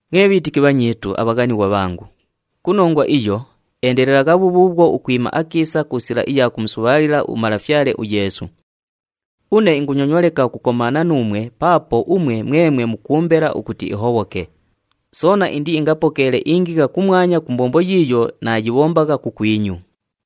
Mwe bhiitiki bhanyiitu abhaghanighwa bhangu, ku nongwa iyo, endelelagha bhubhuubhwo ukwima akiisa ku sila iya kumusubhaalila uMalafyale uYeesu. Une ingunyonywa leka ukukomaana nuumwe paapo umwe mwemwe mukuumbela ukuti ihobhoke, soona indiingapokeele ingigha kumwanya ku mbombo yiiyo naayibhombagha kukwinyu.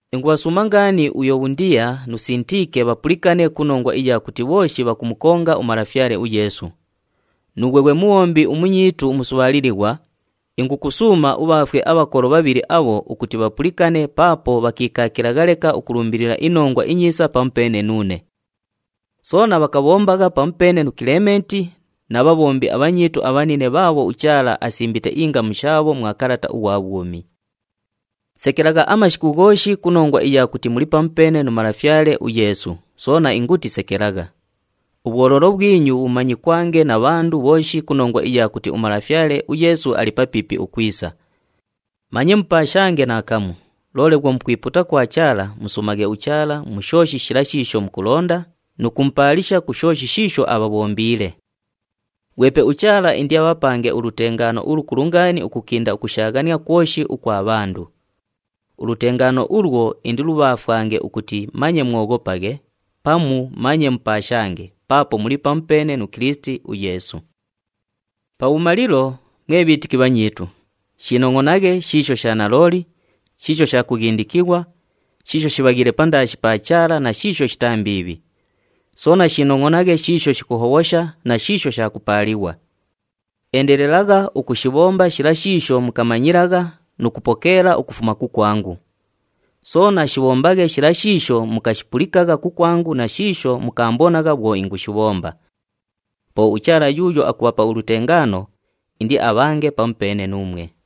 Ingubhasuuma ngaani uYubhondiya nu Sintiike bhapulikane ku nongwa iya kuti bhooshi bhakumukonga uMalafyale uYeesu. Nuughwe ghwe mubhombi umunyiitu umusubhaalilighwa, ingukusuuma ubhaafwe abhakolo bhabhili abho ukuti bhapulikane paapo bhakiikaakilagha leka ukulumbilila iNongwa iNyiisa pamupeene nuune. Soona bhakabhombagha pamupeene nu Kilementi na bhabhombi abhanyiitu abhanine bhaabho uChaala asimbite ingamu shaabho mwa kalata ughwa bhwumi. Sekelagha amashiku ghooshi ku nongwa iya kuti muli pamupeene nu Malafyale uYeesu, soona inguti, sekelagha! Ubhwoloolo bhwinyu bhumanyikwange na bhandu bhooshi ku nongwa iya kuti uMalafyale uYeesu ali papiipi ukwisa. Manye mupaashange naakamu, loole bhwo mukwipuuta kwa Chaala, musuumaghe uChaala mu shooshi shila shiisho mukulonda nu kumupaalisha ku shooshi shiisho abhabhombiile. Ghwepe uChaala indiabhapange ulutengaano ulukulu ngaani ukukinda ukushaaghania kwoshi ukwa bhandu. Ulutengaano ulwo indilubhaafwange ukuti manye mwoghopaghe pamu manye mupaashange paapo muli pamupeene nu Kilisiti uYeesu. Pabhumalilo, mwe bhiitiki bhanyiitu, shiinongʼonaghe shiisho sha nalooli, shiisho sha kughindikighwa, shiisho shibhaghiile pandaashi pa Chaala na shiisho shitaa mbiibhi. Soona shiinongʼonaghe shiisho shikuhobhosha na shiisho sha kupaalighwa. Endelelagha ukushibhomba shila shiisho mukamanyilagha nu kupokeela ukufuma kukwangu. Soona shibhombaghe shila shiisho mukashipulikagha kukwangu na shiisho mukaambonagha bhwo ingushibhomba. Po uChaala yuuyo akubhapa ulutengaano, indiabhange pamupeene nuumwe.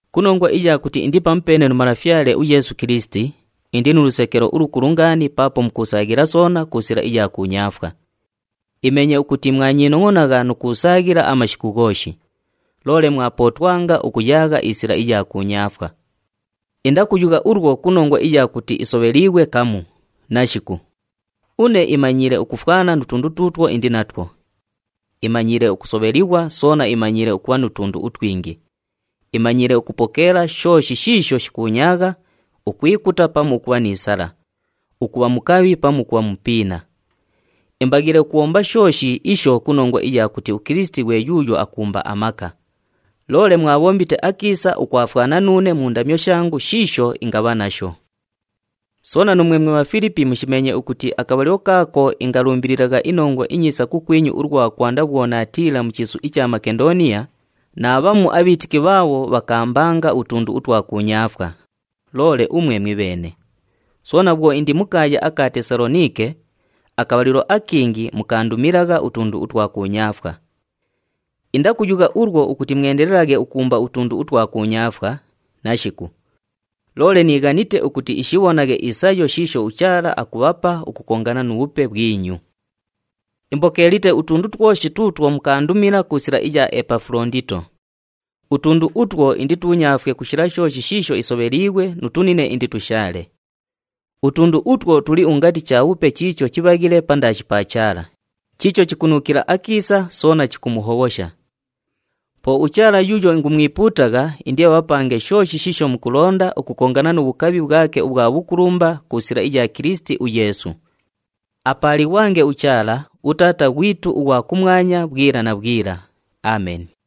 Ku nongwa iya kuti indi pamupeene nu Malafyale uYeesu Kilisiti, indi nu lusekelo ulukulu ngaani paapo mukuusaaghila soona ku sila iya kuunyaafwa. Imeenye ukuti mwanyiinongʼonagha nu kuusaaghila amashiku ghooshi, loole mwapootwanga ukuyaagha isila iya kuunyaafwa. Indakuyugha ulwo ku nongwa iya kuti isobheliighwe kamu, nashiku! Une imanyiile ukufwana nu tundu tuutwo indi natwo. Imanyiile ukusobhelighwa soona imanyiile ukubha nu tundu utwingi, imanyiile ukupokeela shooshi shiisho shikuunyaagha, ukwikuta pamu ukubha ni sala, ukubha mukabhi pamu ukubha mupiina. Imbaghiile ukubhomba shooshi isho ku nongwa iya kuti uKilisiti ghwe yuuyo akuumba amaka. Loole mwabhombite akiisa ukwafwana nuune mu ndamyo shangu shiisho ingabha nasho. Soona, nuumwe mwe Bhafilipi mushimeenye ukuti akabhalilo kaako ingalumbililagha iNongwa iNyiisa kukwinyu ulwa kwanda bhwo naatiila mu chiisu icha Makendooniya, naabhamu abhiitiki bhaabho bhakaambanga utundu utwa kuunyaafwa, loole umwe mwibheene. Soona bhwo indi mu kaaya aka Tesaloniike, akabhalilo akingi mukaandumilagha utundu utwa kuunyaafwa. Indakuyugha ulwo ukuti mwendelelaghe ukuumba utundu utwa kuunyaafwa, nashiku. Loole niighanite ukuti ishibhonaghe isayo shiisho uChaala akubhapa ukukongana nu bhupe bhwinyu. Imbokeelite utundu twoshi tuutwo mukaandumila ku sila iya Epafulondito. Utundu utwo inditunyaafwe ku shila shooshi shiisho isobheliighwe nu tunine inditushaale. Utundu utwo tuli ungati chabhupe chiicho chibhaghile pandaashi pa Chaala, chiicho chikunuukila akiisa soona chikumuhobhosha. Po uChaala yuuyo ingumwipuutagha indiabhapange shooshi shiisho mukulonda ukukongana nu bhukabhi bhwake ubhwa bhukulumba ku sila iya Kilisiti uYeesu. Apaalighwange uChaala, uTaata ghwitu ughwa kumwanya bhwila na bhwila. Ameni.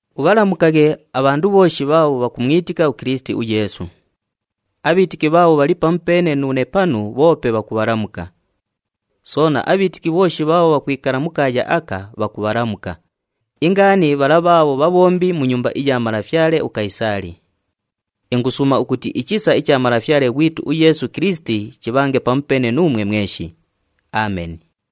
Ubhalamukaghe abhandu bhooshi bhaabho bhakumwitika uKilisiti uYeesu. Abhiitiki bhaabho bhali pamupeene nuune panu bhoope bhakubhalamuka. Soona, abhiitiki bhooshi bhaabho bhakwikala mu kaaya aka, bhakubhalamuka, ingaani bhala bhaabho bhabhombi mu nyumba iya malafyale uKayisaali. Ingusuuma ukuti ichisa icha Malafyale ghwitu uYeesu Kilisiti chibhange pamupeene nuumwe mweshi. Ameni.